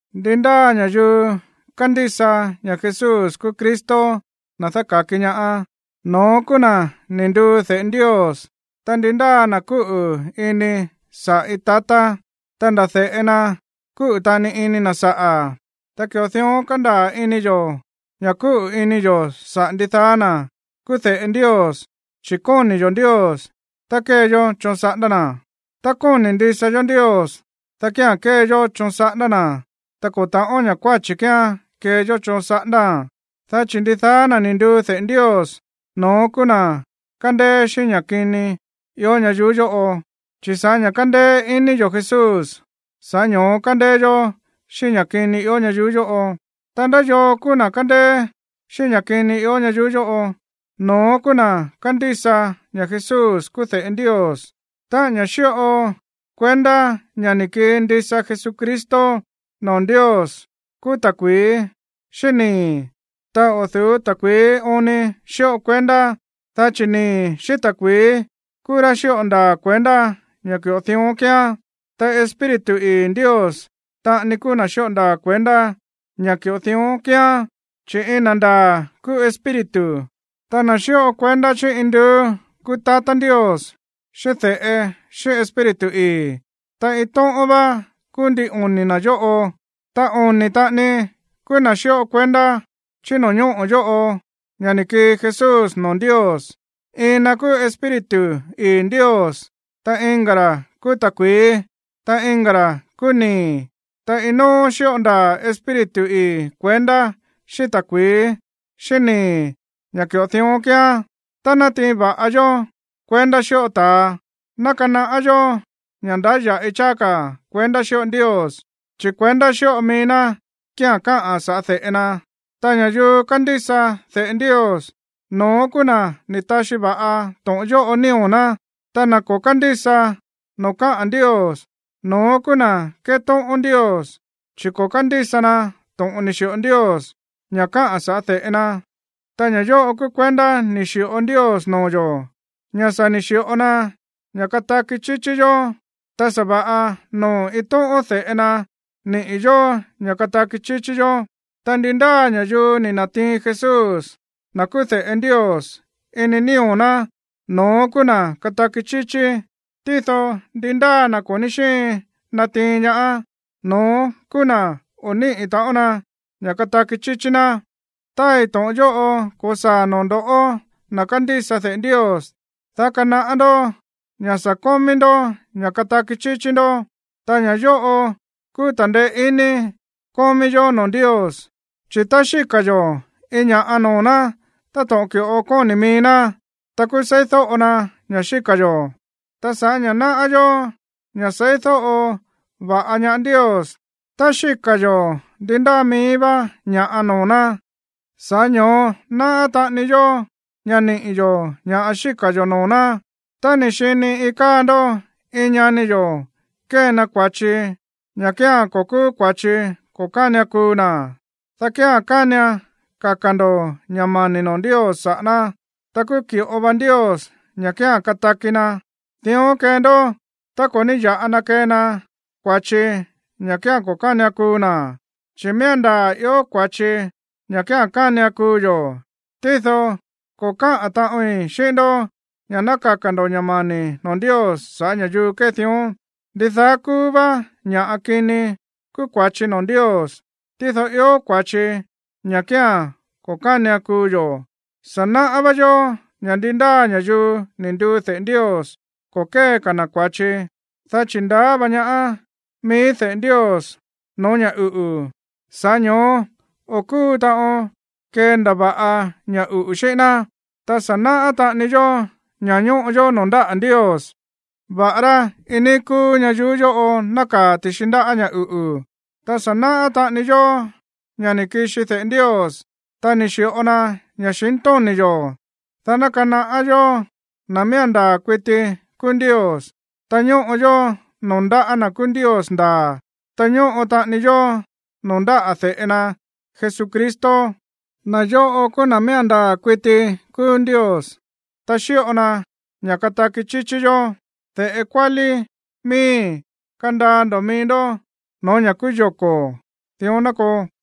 Ndi ndáa ña̱yuu kándísa ña̱ Jesús kúú Cristo, na̱ dáka̱ki ñaá, no̱ón kúú na̱ ni̱ nduu de̱ꞌe Ndios. Ta ndi ndáa na̱ kúꞌu̱ ini saꞌa̱ iin tatá, ta nda̱ de̱ꞌe na kúꞌu̱ taꞌani ini na̱ saꞌa̱. Ta ki̱ꞌo dión kándaa̱ ini yo̱ ña̱ kúꞌu̱ ini yo̱ saꞌa̱ ndidaá na̱ kúú de̱ꞌe Ndios, chi̱ kóni̱ yo̱ Ndios, ta kée yó choon saꞌándá na̱. Tá kóni̱ ndisa yó Ndios, dá kía̱n kee yó choon saꞌándá na̱. Ta ko̱ ta̱ꞌón ña̱ kuáchi̱ kíán kee yó choon saꞌándáa̱n, dá chi̱ ndidaá na̱ ni̱ nduu de̱ꞌe Ndios, no̱ón kúú na̱ kándéé xíꞌín ña̱ kini ió ñayuú yóꞌo. Chi̱ sa̱ꞌá ña̱ kándéé iní yo̱ Jesús, sa̱ꞌá ño̱ó kándéé yó xíꞌín ña̱ kini ió ñayuú yóꞌo. Ta, ¿ndá yoo kúú na̱ kándéé xíꞌín ña̱ kini ió ñayuú yóꞌo? No̱ón kúú na̱ kándísa ña̱ Jesús kúú de̱ꞌe Ndios. Táꞌa̱n ña̱ xíꞌo kuendá ña̱ ni̱ kii ndisa Jesucristo noo̱ Ndios kúú ta̱kui̱í xíꞌín nii̱. Ta o̱ du̱ú ta̱kui̱í oon ni xíꞌo kuendá, dá chi̱ nii̱ xíꞌín ta̱kui̱í kúú ra̱ xíꞌo ndaa̱ kuendá ña̱ ki̱ꞌo dión kíán. Ta Espíritu ii̱ Ndios taꞌani kúú na̱ xíꞌo ndaa̱ kuendá ña̱ ki̱ꞌo dión kíán, chi̱ iin na̱ ndaa̱ kúú Espíritu. [Ta na̱ xíꞌo kuendá chí induú kúú tatá Ndios, xíꞌín de̱ꞌe, xíꞌín Espíritu ii̱. Ta iin tóꞌón vá kúú ndin oni̱ na̱ yóꞌo.] Ta oni̱ taꞌani kúú ña̱ xíꞌo kuendá chí no̱ñóꞌo̱ yóꞌo ña̱ ni̱ kii Jesús noo̱ Ndios. Iin na̱ kúú Espíritu ii̱ Ndios, ta iin ka̱ ra̱ kúú ta̱kui̱í, ta iin ka̱ ra̱ kúú nii̱. Ta iin nóó xíꞌo ndaa̱ Espíritu ii̱ kuendá xíꞌín ta̱kui̱í xíꞌín nii̱ ña̱ ki̱ꞌo dión kíán. Tá nátiin va̱ꞌa yó kuendá xíꞌo ta̱a, ná kanaꞌá yó ña̱ ndáya̱ꞌi cháá ka̱ kuendá xíꞌo Ndios, chi̱ kuendá xíꞌo mií ná kía̱n káꞌa̱n sa̱ꞌá de̱ꞌe na. Ta ña̱yuu kándísa de̱ꞌe Ndios, no̱ón kúú na̱ ni̱ taxi va̱ꞌa to̱ꞌon yóꞌo nío̱ ná. Ta na̱ ko̱ kándísa noo̱ káꞌa̱n Ndios, no̱ón kúú na̱ kétóꞌón Ndios, chi̱ ko̱ kándísa na to̱ꞌon ni̱ xi̱ꞌo Ndios, ña̱ káꞌa̱n saꞌa̱ de̱ꞌe na. Ta ña̱ yóꞌo kúú kuendá ni̱ xi̱ꞌo Ndios noo̱ yo̱, ña̱ sa̱ ni̱ xi̱ꞌo na ña̱ kataki chíchí yó, ta sa̱va̱ꞌa noo̱ iin tóꞌón de̱ꞌe na niꞌi̱ yo̱ ña̱ kataki chíchí yó. Ta ndi ndáa ña̱yuu ni̱ na̱tiin Jesús, na̱ kúú de̱ꞌe Ndios, ini nío̱ ná, no̱ón kúú na̱ kataki chíchí. Tído ndi ndáa na̱ ko̱ ní xíin natiin ñaá, no̱ón kúú ná o̱ níꞌi̱ taꞌon na ña̱ kataki chíchí ná. Táai to̱ꞌon yóꞌo ko̱saa̱ noo̱ ndo̱ꞌó, na̱ kándísa de̱ꞌe Ndios, dá kanaꞌá ndó ña̱ sa̱ kómí ndó ña̱ kataki chíchí ndó. Ta ña̱ yóꞌo kúú ta̱ndeé iní kómí yó noo̱ Ndios, chi̱ tá xíka̱ yo̱ iin ña̱ꞌa noo̱ ná táto̱ꞌon ki̱ꞌo kóni̱ mií ná, ta kúú seídóꞌo na ña̱ xíka̱ yo̱. Ta sa̱ꞌá ña̱ náꞌá yó ña̱ seídóꞌo va̱ꞌa ñaá Ndios tá xíka̱ yo̱ ndi ndáa mií vá ña̱ꞌa noo̱ ná, sa̱ꞌá ño̱ó náꞌá taꞌani yó ña̱ niꞌi̱ yo̱ ña̱ xíka̱ yo̱ noo̱ ná. Tá ni̱ xini iin káa ndó iin ñani yo̱ kée na kua̱chi, ña̱ kía̱n ko̱ kúú kua̱chi ko̱ kánian kuu na̱, dá kía̱n kánian kaka̱ ndo̱ ña̱ mani̱ noo̱ Ndios saꞌa̱ ná, ta kúú ki̱ꞌo vá Ndios ña̱ kía̱n kataki na̱. Dión kee ndó tá ko̱ ní ya̱ꞌa na kee na kua̱chi ña̱ kía̱n ko̱ kánian kuu na̱. Chi̱ miía̱n ndaa̱ ió kua̱chi, ña̱ kía̱n kánian kuu yo̱. Tído ko̱ káꞌa̱n taꞌoin xíꞌín ndó ña̱ ná kaka̱ ndo̱ ña̱ mani̱ noo̱ Ndios saꞌa̱ ña̱yuu kée dión. Ndidaá kúú vá ña̱ꞌa kini kúú kua̱chi noo̱ Ndios. Tído ió kua̱chi, ña̱ kía̱n ko̱ kánian kuu yo̱. Sa̱ náꞌá vá yó ña̱ ndi ndáa ña̱yuu ni̱ nduu de̱ꞌe Ndios, ko̱ kée ka̱ na̱ kua̱chi, dá chi̱ ndaá va ñaá mií de̱ꞌe Ndios no̱ó ña̱ uꞌu̱, sa̱ꞌá ño̱ó o̱ kúu taꞌon kendava̱ꞌa ña̱ uꞌu̱ xíꞌín ná. Ta sa̱ náꞌá taꞌani yó ña̱ ñóꞌo yó noo̱ ndáꞌa̱ Ndios, va̱ꞌará iin níí kúú ñayuú yóꞌo nákaa̱ ti̱xi ndáꞌa̱ ña̱ uꞌu̱. Ta sa̱ náꞌá taꞌani yó ña̱ ni̱ kixi de̱ꞌe Ndios, ta ni̱ xi̱ꞌo na ña̱xintóni̱ yo̱, dá ná kanaꞌá yó na̱ miía̱n ndaa̱ kuiti kúú Ndios. Ta ñóꞌo yó noo̱ ndáꞌa̱ na̱ kúú Ndios ndaa̱, ta ñóꞌo taꞌani yó noo̱ ndáꞌa̱ de̱ꞌe na Jesucristo. Na̱ yóꞌo kúú na̱ miía̱n ndaa̱ kuiti kúú Ndios, ta xíꞌo na ña̱ kataki chíchí yó. De̱ꞌe kuálí miíi̱, kandaa ndo̱ mií ndó no̱ó ña̱ kúú yoko̱. Dión ná koo.